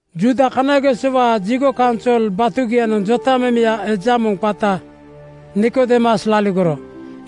Juuda kanagesowaa jigo kaunsol batugianoŋ jotamemeya eja moŋ qata Nikodeemus laligoro.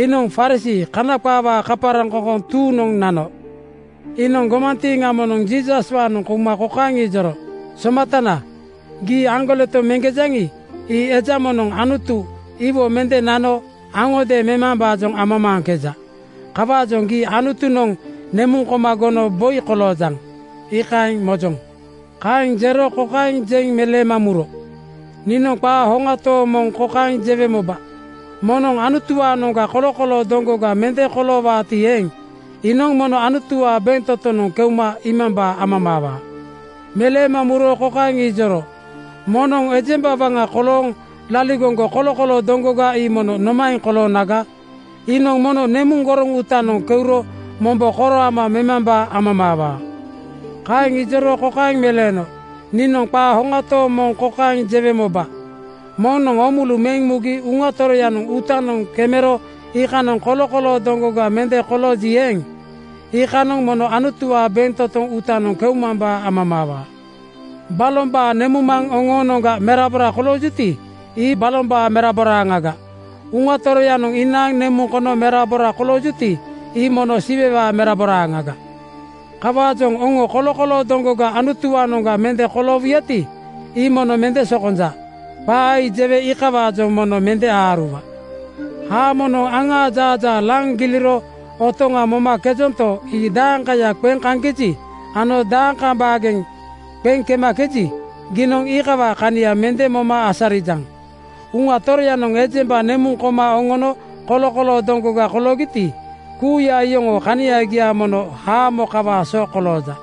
Iinoŋ Farisii (Kana qaawaa kaparaŋkoŋkoŋ) tuuŋnoŋ nano. Iinoŋ gomantiiŋa moŋnoŋ Jiisaswaanoŋ kouma kokaeŋ ijoro, “Somatana, gii aŋgoleto meŋkejaŋi, ii eja moŋnoŋ Anutu iwo mende nano aŋodeeŋ memambaa amamaaŋkeja. Kawaajoŋ gii Anutunoŋ nemuŋ koma gono boi koloojaŋ, iikaeŋ mojoŋ.” Kaeŋ jero kokaeŋ jeŋ meleema muro, “Niinoŋ qaa hoŋa tooŋ moŋ kokaeŋ jewe moba: Moŋnoŋ Anutuwaanoŋga kolokoloo doŋgoga mende koloowaati eeŋ, iinoŋ mono Anutuwaa bentotonoŋ keuma iimambaa amamaawaa.” Meleema muro kokaeŋ ijoro, “Moŋnoŋ ejemba waŋa kolooŋ laligoŋgo kolokoloo doŋgoga ii mono nomaeŋ koloonaga? Iinoŋ mono nemuŋ goroŋ uutanoŋ keuro mombo koro ama memambaa amamaawaa.” Kaeŋ ijoro kokaeŋ meleeno, “Niinoŋ qaa hoŋa tooŋ moŋ kokaeŋ jewe moba: Moŋnoŋ oomulu meŋ mugi Uŋa Toroyanoŋ uutanoŋ kemero iikanoŋ kolokoloo doŋgoga mende kolooji eeŋ, iikaaŋanoŋ mono Anutuwaa bentotoŋ uutanoŋ keumambaa amamaawaa. Balombaa nemuŋmaŋ oŋoonoŋga merabora koloojuti, ii balombaa meraboraaŋaga. Uŋa Toroyanoŋ inaaŋ nemuŋ kono merabora kolooŋkejuti, ii mono Siwewaa meraboraaŋaga. “Kawaajoŋ oŋo kolokoloo doŋgoga Anutuwaanoŋga mende koloowuyati, ii mono mende sokonja. Qaa ii jewe iikawaajoŋ mono mende aaruwa. Haamonoŋ aŋaa jaajaa laŋ giliro otoŋa momakejanto, ii dakaya qeŋ kaŋkeji ano dakaaŋ baageŋ qeŋ kemakeji, giinoŋ iikawaa kania mende moma asarijaŋ. Uŋa Toroyanoŋ ejemba nemuŋ koma oŋono kolokoloo doŋgoga koloogiti, kuuya iyoŋoo kaniagia mono haamo kawaa so kolooja.”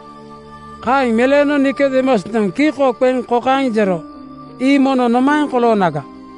Kaeŋ meleeno Nikodeemusnoŋ kiko qeŋ kokaeŋ jero, “Ii mono nomaeŋ koloonaga?”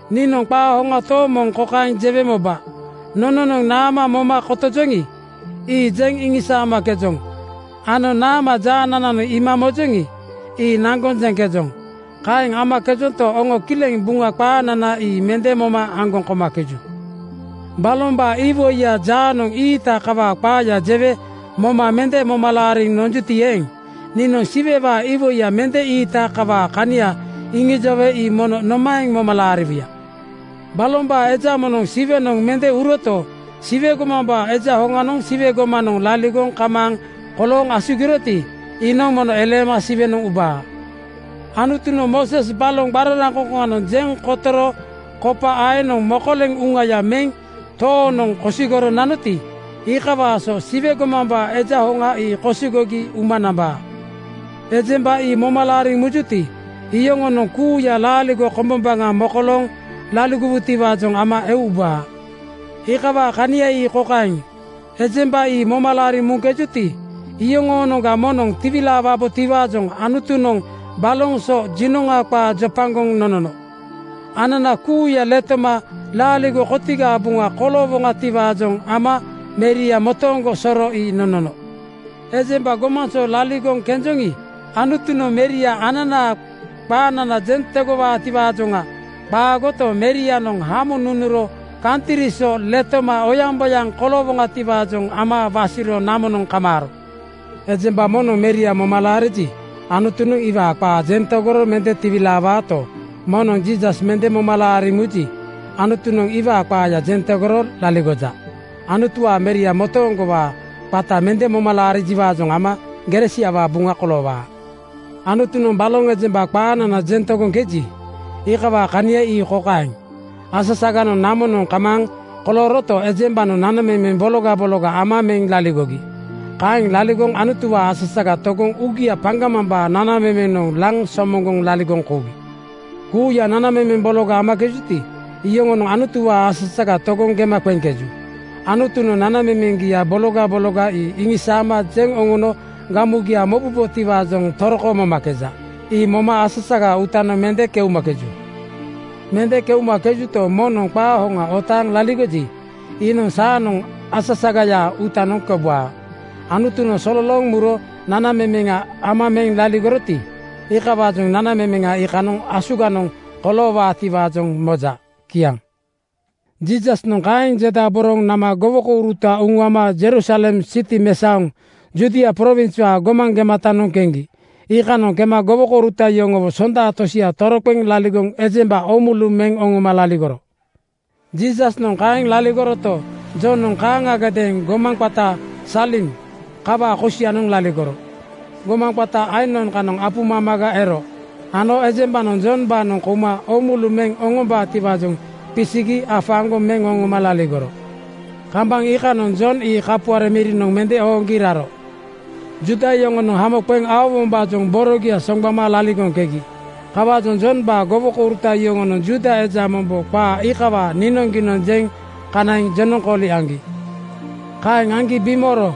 Niinoŋ qaa hoŋa tooŋ moŋ kokaeŋ jewe moba: Nononoŋ naama moma kotojoŋi, ii jeŋ iŋisaamakejoŋ ano naama jaanananoŋ iima mojoŋi, ii naŋgoŋ jeŋkejoŋ. Kaeŋ amakejonto, oŋonoŋ kileŋ Buŋa qaanana ii mende moma aŋgoŋ komakeju. “Balombaa iwoiya jaanoŋ ii-iita kawaa qaaya jewe moma mende moma laariŋ nonjuti eeŋ, niinoŋ Siwewaa iwoiya mende ii-iita kawaa kania iŋijowe ii mono nomaeŋ moma laariwuya? Balombaa eja moŋnoŋ Siwenoŋ mende uroto, Siwe gomambaa Eja hoŋanoŋ Siwe gomanoŋ laligoŋ kamaaŋ kolooŋ asugiroti, iinoŋ mono eleema Siwenoŋ ubaa. “Anutunoŋ Mooses baloŋ qararaŋkoŋkoŋanoŋ jeŋ kotoro kopa aenoŋ mokoleŋ uŋaya meŋ toonoŋ kosigoro nanoti, iikawaa so Siwe gomambaa Eja Hoŋa ii kosigogi uma nambaa. Ejemba ii moma laariŋ mujuti, iyoŋonoŋ kuuya laaligo kombombaŋa mokolooŋ laligowutiwaajoŋ ama eu ubaa. “Iikawaa kania ii kokaeŋ: Ejemba ii moma laariŋ muŋkejuti, iyoŋoonoŋga moŋnoŋ tiwilaawaabotiwaajoŋ Anutunoŋ baloŋ so jinoŋa qaa jopagoŋ nonono. Anana kuuya letoma laaligo kotigaa buŋa koloowoŋatiwaajoŋ ama Meria motooŋgo soro ii nonono. Ejemba gomaŋ so laligoŋ kenjoŋi, Anutunoŋ Meria ananaa qaanana jeŋ tegowaatiwaajoŋa qaagoto, Merianoŋ hamo nunuro kantri so letoma oyaŋboyaŋ koloowoŋatiwaajoŋ ama wasiro namonoŋ kamaaro. “Ejemba moŋnoŋ Meria moma laariji, Anutunoŋ iwaa qaa jeŋ tegoro mende tiwilaawaato, moŋnoŋ Jiisas mende moma laariŋ muji, Anutunoŋ iwaa qaa jeŋ tegoro laligoja. Anutuwaa Meria motooŋgowaa qata mende moma laarijiwaajoŋ ama gere siawaa buŋa koloowaa. Anutunoŋ baloŋ ejemba qaanana jeŋ tegoŋkeji, iikawaa kania ii kokaeŋ: Asasaganoŋ namonoŋ kamaaŋ kolooroto, ejembanoŋ nanamemeŋ bologa bologa ama meŋ laligogi. Kaeŋ laligoŋ Anutuwaa asasaga togoŋ uugia paŋgamambaa nanamemenoŋ laŋ somoŋgoŋ laligoŋ kougi. “Kuuya nanamemeŋ bologa amakejuti, iyoŋonoŋ Anutuwaa asasaga togoŋ gema qeŋkeju. Anutunoŋ nanamemeŋgia bologa bologa ii iŋisaama jeŋ oŋono gamugia mobubotiwaajoŋ toroko momakeju. Ii moma asasagaa uutanoŋ mende keumakeju. Mende keumakejuto, moŋnoŋ qaa hoŋa otaaŋ laligoji, iinoŋ saanoŋ asasagayaa uutanoŋ keubaa. Anutunoŋ sololooŋ muro nanamemeŋa ama meŋ laligoroti, iikawaajoŋ nanamemeŋa iikanoŋ asuganoŋ koloowaatiwaajoŋ moja.” Kiaŋ. Jiisasnoŋ kaeŋ jedaboroŋ nama gowokouruta uŋuama Jerusalem siti mesaoŋ Judia prowinswaa gomaŋ gematanoŋ keŋgi. Iikanoŋ kema gowokouruta yoŋowo sonda tosia toroqeŋ laligoŋ ejemba oomulu meŋ oŋoma laligoro. Jiisasnoŋ kaeŋ laligoroto, Jonoŋ kaaŋagadeeŋ gomaŋ qata Salim kawaa kosianoŋ laligoro. Gomaŋ qata Ainon kanoŋ apu mamaga ero ano ejembanoŋ Jombaanoŋ kouma oomulu meŋ oŋombatiwaajoŋ qisigi afaaŋgoŋ meŋ oŋoma laligoro. Kambaŋ iikanoŋ Jon ii kapuare mirinoŋ mende ooŋgi raro. Juuda yoŋonoŋ hamo qeŋ aowombaajoŋ borogia soŋgbama laligoŋkegi. Kawaajoŋ Jombaa gowokouruta yoŋonoŋ Juuda eja mombo qaa iikawaa niinoŋgiinoŋ jeŋ kanaiŋ jenoŋkooli aŋgi. Kaeŋ aŋgi bimooro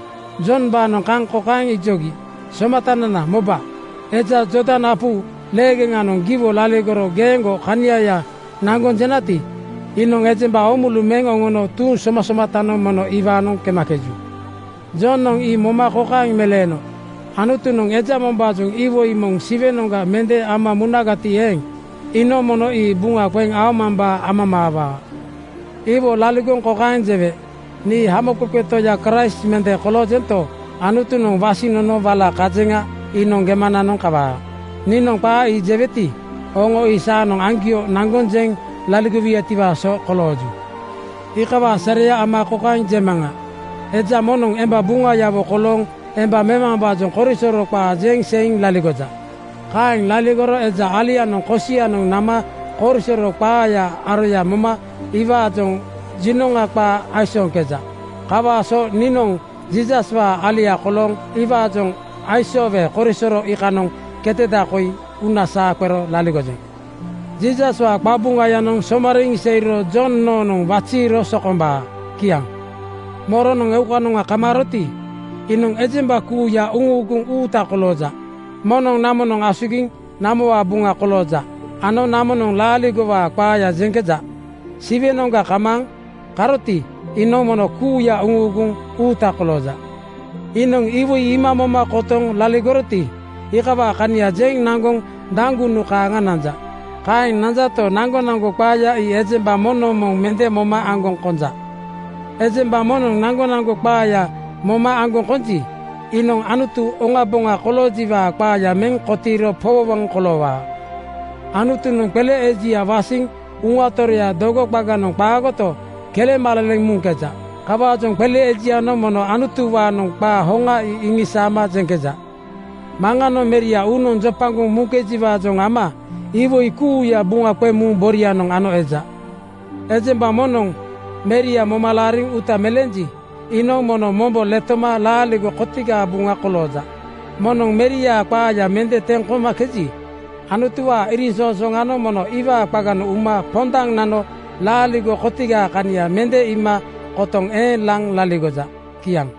Jombaanoŋ kaŋ kokaeŋ ijogi, “Somatanana moba, eja Jordan apu leegeŋanoŋ giwo laligoro geeŋgo kaniaya naŋgoŋ jenati, iinoŋ ejemba oomulu meŋ oŋono tuuŋ somasomatanoŋ mono iwaanoŋ kemakeju.” Jonoŋ ii moma kokaeŋ meleeno, “Anutunoŋ eja mombaajoŋ iwoi moŋ Siwenoŋga mende ama munagati eeŋ, iinoŋ mono ii buŋa qeŋ aomambaa amamaawaa. Iwo laligoŋ kokaeŋ jewe, ‘Nii Hamoqeqe Toya Kraist mende koloojento, Anutunoŋ wasiŋ nono wala kajeŋa iinoŋ gemananoŋ kawaa.’ Niinoŋ qaa ii jeweti, oŋo ii saanoŋ oŋoaŋgio naŋgoŋ jeŋ laligowuyatiwaa so kolooju. Iikawaa sareya ama kokaeŋ jemaŋa: Eja moŋnoŋ emba buŋayawo kolooŋ emba memambaajoŋ korisoro qaa jeŋ seiŋ laligoja. Kaeŋ laligoro eja alianoŋ kosianoŋ nama korisoro qaayaa aroya moma iwaajoŋ jinoŋa qaa aisooŋkeja. Kawaa so niinoŋ Jiisaswaa alia kolooŋ iwaajoŋ aisoowe korisoro iikanoŋ keteda koi uuna saa qero laligojeŋ. Jiisaswaa qabuŋayanoŋ somariiŋ seiro Jon noonoŋ waziiro sokombaa.” Kiaŋ. “Moronoŋ eukanoŋa kamaaroti, iinoŋ ejemba kuuya uŋuuguŋ uuta kolooja. Moŋnoŋ namonoŋ asugiŋ namowaa buŋa kolooja ano namonoŋ laaligowaa qaaya jeŋkeja. Siwenoŋga kamaaŋ karoti, iinoŋ mono kuuya uŋuuguŋ uuta kolooja. Iinoŋ iwoi iima moma kotoŋ laligoroti, iikawaa kania jeŋ naŋgoŋ daŋgunu kaaŋa nanja. Kaeŋ nanjato, naŋgonaŋgo qaaya ii ejemba moŋnoŋ moŋ mende moma aŋgoŋ konja. “Ejemba moŋnoŋ naŋgonaŋgo qaaya moma aŋgoŋ konji, iinoŋ Anutu oŋaboŋa koloojiwaa qaaya meŋ kotiiro powowoŋ koloowaa. Anutunoŋ qele ejia wasiŋ Uŋaya Toroya dogo qaganoŋ qaagoto, kelemaleleŋ muŋkeja. Kawaajoŋ qele ejianoŋ mono Anutuwaanoŋ qaa hoŋa ii iŋisaama jeŋkeja. Maŋanoŋ Meria uunoŋ jopagoŋ muŋkejiwaajoŋ ama iwoi kuuya buŋa qeŋ muŋ borianoŋ ano eja. “Ejemba moŋnoŋ Meria moma laariŋ uuta meleenji, iinoŋ mono mombo letoma laaligo kotigaa buŋa kolooja. Moŋnoŋ Meriaa qaaya mende teŋ komakeji, Anutuwaa iriŋsoŋsooŋanoŋ mono iwaa qaganoŋ uma pondaŋ nano laaligo kotigaa kania mende iima kotoŋ eeŋ laŋ laligoja.” Kiaŋ